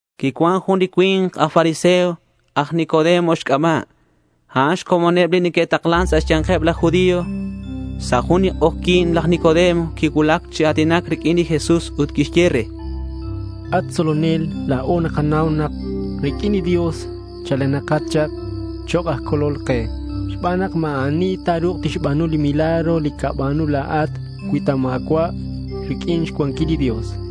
Quicuan jun li cui̱nk aj fariseo aj Nicodemo xc'aba'. A'an xcomoneb li neque'taklan sa' xya̱nkeb laj judío. Sa' jun li k'ojyi̱n laj Nicodemo quicuulac chi a̱tinac riq'uin li Jesús ut quixye re: —At tzolonel, la̱o nakanau nak riq'uin li Dios chalenakat chak chok' aj tzolol ke xban nak ma̱ ani ta̱ru̱k tixba̱nu li milagros li nacaba̱nu la̱at cui ta ma̱cua' riq'uin xcuanquil li Dios, chan.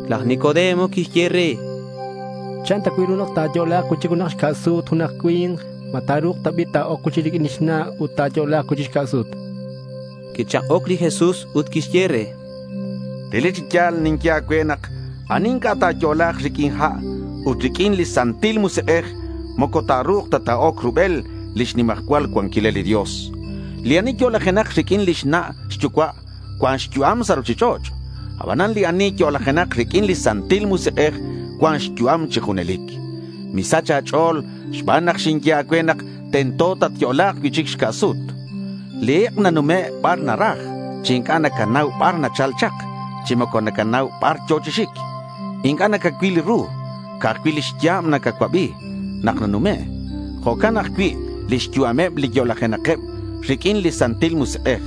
Laj Nicodemo quixye re: —¿Chan ta cui' ru nak ta̱yo'la̱k cui'chic xca' sut junak cui̱nk? ¿Ma ta̱ru̱k ta bi' ta̱oc cui'chic riq'uin lix na' ut ta̱yo'la̱k cui'chic xca' sut? chan. Quichak'oc li Jesús ut quixye re: —Relic chi ya̱l ninye a̱cue nak ani inc'a' ta̱yo'la̱k riq'uin ha' ut riq'uin li Santil Musik'ej moco ta̱ru̱k ta ta̱oc rubel lix nimajcual cuanquilal li Dios. Li ani yo'lajenak riq'uin lix na' xyucua' cuan xyu'am sa' ruchich'och'. Abanan li ani yo'lajenak riq'uin li Santil Musik'ej cuan xyu'am chi junelic. Misach a̱ch'o̱l xban nak xinye a̱cue nak tento tatyo'la̱k cui'chic xca' sut. Li ik' nanume' bar naraj chi inc'a' nacanau bar nachal chak chi moco nacanau bar yo̱ chi xic. Inc'a' nacacuil ru. Ca'aj cui' lix ya̱b nacacuabi nak nanume'. Jo'can ajcui' lix yu'ameb li yo'lajenakeb riq'uin li Santil Musik'ej.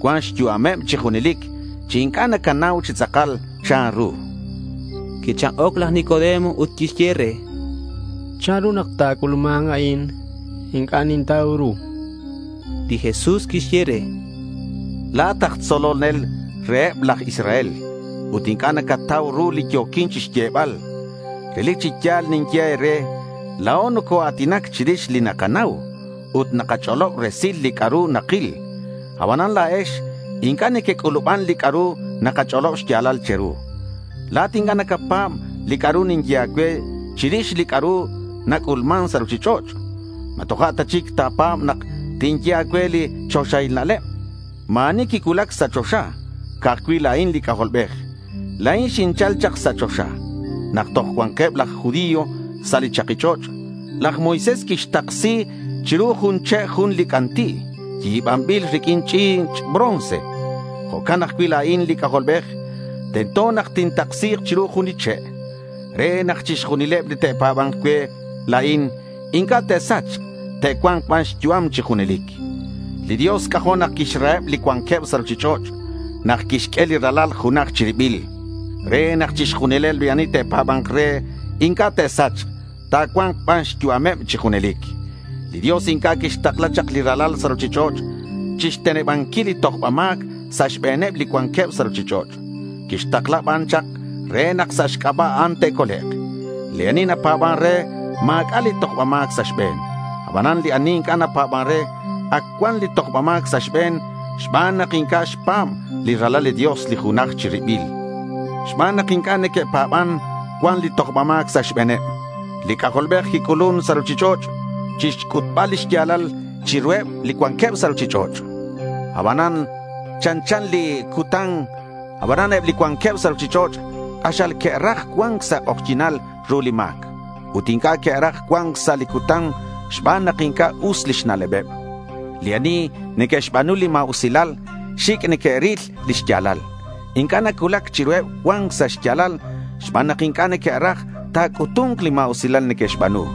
Cuan xyu'ameb chi junelic chi inc'a' nacanau chi tz'akal chanru, chan li Jesús. Quichak'oc laj Nicodemo ut quixye re: —¿Chanru nak nac'ulman a'in? Inc'a' nintau ru, chan. Li Jesús quixye re: —La̱at aj tzolol reheb laj Israel ut inc'a' nacatau ru li yo̱quin chixyebal. Relic chi ya̱l ninye e̱re: La̱o nocoa̱tinac chirix li nakanau. Ut nakach'olob resil li c'a'ru nakil. Abanan la̱ex inc'a' nequec'u̱luban li c'a'ru nakach'olob xya̱lal che̱ru. La̱at inc'a' nacapa̱b li c'a'ru ninye a̱cue chirix li c'a'ru nac'ulman sa' ruchich'och'. ¿Ma toja' ta chic ta̱pa̱b nak tinye a̱cue li choxahil na'leb? Ma̱ ani quicuulac sa' choxa. Ca'aj cui' la̱in li C'ajolbej. La̱in xinchal chak sa' choxa. Nak toj cuanqueb laj judío sa' li chaki ch'och', laj Moisés quixtaksi chiru jun che' jun li c'anti' yi̱banbil riq'uin li ch'i̱ch' bronce. Jo'can ajcui' la̱in li C'ajolbej. Tento nak tintaksi̱k chiru jun li che', re nak chixjunileb li te'pa̱ba̱nk cue la̱in inc'a' te'sachk. Te'cua̱nk ban xyu'am chi junelic. Li Dios c'ajo' nak quixraheb li cuanqueb sa' ruchich'och' nak quixq'ue li Ralal junaj chi ribil re nak chixjunileb li ani te'pa̱ba̱nk re inc'a' te'sachk. Ta̱cua̱nk ban xyu'ameb chi junelic. Li Dios inc'a' quixtakla chak li Ralal sa' ruchich'och' chixtenebanquil li tojba ma̱c sa' xbe̱neb li cuanqueb sa' ruchich'och'. Quixtakla ban chak re nak sa' xc'aba' a'an te'colek'. Li ani napa̱ban re, ma̱c'a' li tojba ma̱c sa' xbe̱n. Abanan li ani inc'a' napa̱ban re, ac cuan li tojba ma̱c sa' xbe̱n xban nak inc'a' xpa̱b li Ralal li Dios, li junaj chi ribil. Xban nak inc'a' neque'pa̱ban, cuan li tojba ma̱c sa' xbe̱neb. Li C'ajolbej quic'ulun sa' ruchich'och' chixc'utbal li xya̱lal chiruheb li cuanqueb sa' ruchich'och'. A'an chanchan li cutan. Abanan eb li cuanqueb sa' ruchich'och' k'axal que'raj cua̱nc sa' xk'ojyi̱nal ru li ma̱c ut inc'a' que'raj cua̱nc sa' li cutan xban nak inc'a' us lix na'lebeb. Li ani neque'xba̱nu li ma̱usilal, xic' neque'ril li xya̱lal. Inc'a' nacuulac chiruheb cua̱nc sa' xya̱lal xban nak inc'a' neque'raj ta̱c'utu̱nk li ma̱usilal neque'xba̱nu.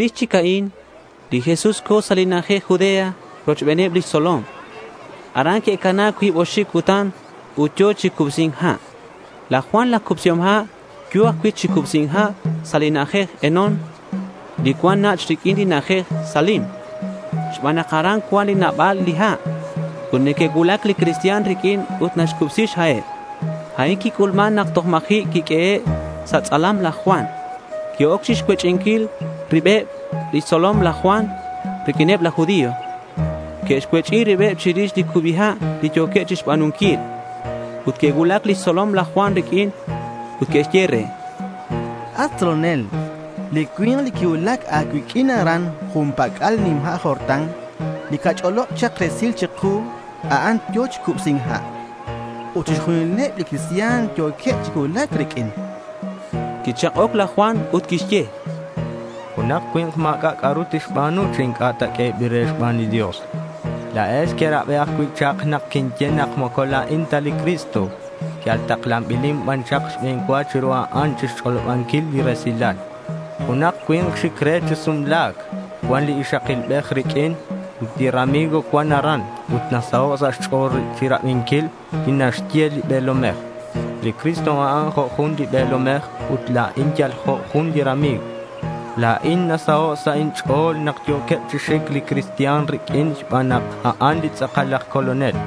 Chirix chic a'in, li Jesús co̱ sa' li na'ajej Judea rochbeneb lix tzolom. Aran que'cana cuib oxib cutan ut yo̱ chi cubsi̱nc ha'. Laj Juan laj Cubsihom Ha' yo̱ ajcui' chi cubsi̱nc ha' sa' li na'ajej Enón li cuan nach' riq'uin li na'ajej Salim xban nak aran cuan nabal li ha'. Ut neque'cuulac li cristian riq'uin ut naxcubsi xha'eb. A'in quic'ulman nak toj ma̱ji' quiq'uehe' sa' tz'alam laj Juan. Que'oc chixcuech'inquil ribeb lix tzolom laj Juan riq'uineb laj judío. Que'xcuech'i ribeb chirix li cubi ha' li yo̱queb chixba̱nunquil. Que'cuulac lix tzolom laj Juan riq'uin ut que'xye re: —At tzolonel, li cui̱nk li quicuulac a̱cuiq'uin aran jun pac'al li nima' Jordán, li cach'olob chak resil chiku, a'an yo̱ chi cubsi̱nc ha'. Ut chixjunileb li cristian yo̱queb chi cuulac riq'uin, chanqueb. Quichak'oc laj Juan ut quixye: —Junak cui̱nk ma̱c'a' c'a'ru tixba̱nu chi inc'a' ta q'uebil re xban li Dios. La̱ex querabi ajcui' chak nak quinye nak moco la̱in ta li Cristo. Yal taklanbilin ban chak xbe̱n cua chiru a'an chixch'olobanquil li resilal. Junak cui̱nk xic re chi sumla̱c cuan li ixakilbej riq'uin. Ut li rami̱g cuan aran ut nasaho' sa' xch'o̱l chirabinquil li naxye li be̱lomej. Li Cristo, a'an jo' jun li be̱lomej ut la̱in yal jo' jun li rami̱g. La̱in nasaho' sa' inch'o̱l nak yo̱queb chi xic li cristian riq'uin xban nak a'an li tz'akal aj Colonel.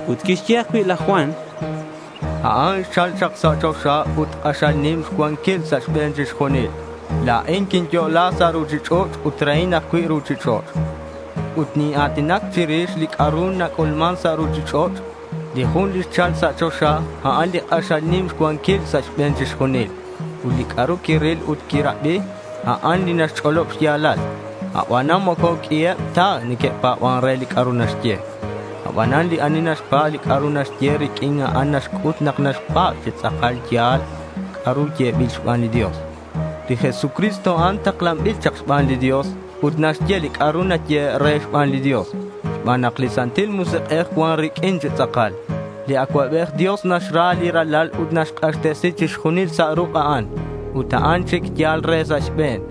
Ut quixye ajcui' laj Juan: —A'an xchal chak sa' choxa ut k'axal nim xcuanquil sa' xbe̱n chixjunil. La̱in quinyo'la sa' ruchich'och' ut rehin ajcui' li ruchich'och'. Ut nina̱tinac chirix li c'a'ru nac'ulman sa' ruchich'och'. Li jun li xchal chak sa' choxa, a'an li k'axal nim xcuanquil sa' xbe̱n chixjunil. Ut li c'a'ru quiril ut quirabi, a'an li naxch'olob xya̱lal. Abanan moco q'uiheb ta li neque'pa̱ban re li c'a'ru naxye. Abanan li ani naxpa̱b li c'a'ru naxye, riq'uin a'an naxc'ut nak naxpa̱b nak tz'akal ya̱l li c'a'ru yebil xban li Dios. Li Jesucristo, a'an taklanbil chak xban li Dios ut naxye li c'a'ru nayehe' re xban li Dios xban nak li Santil Musik'ej cuan riq'uin chi tz'akal. Li Acuabej Dios naxra li Ralal ut quixk'axtesi chixjunil sa' ruk' a'an, ut a'an chic yal re sa' xbe̱n.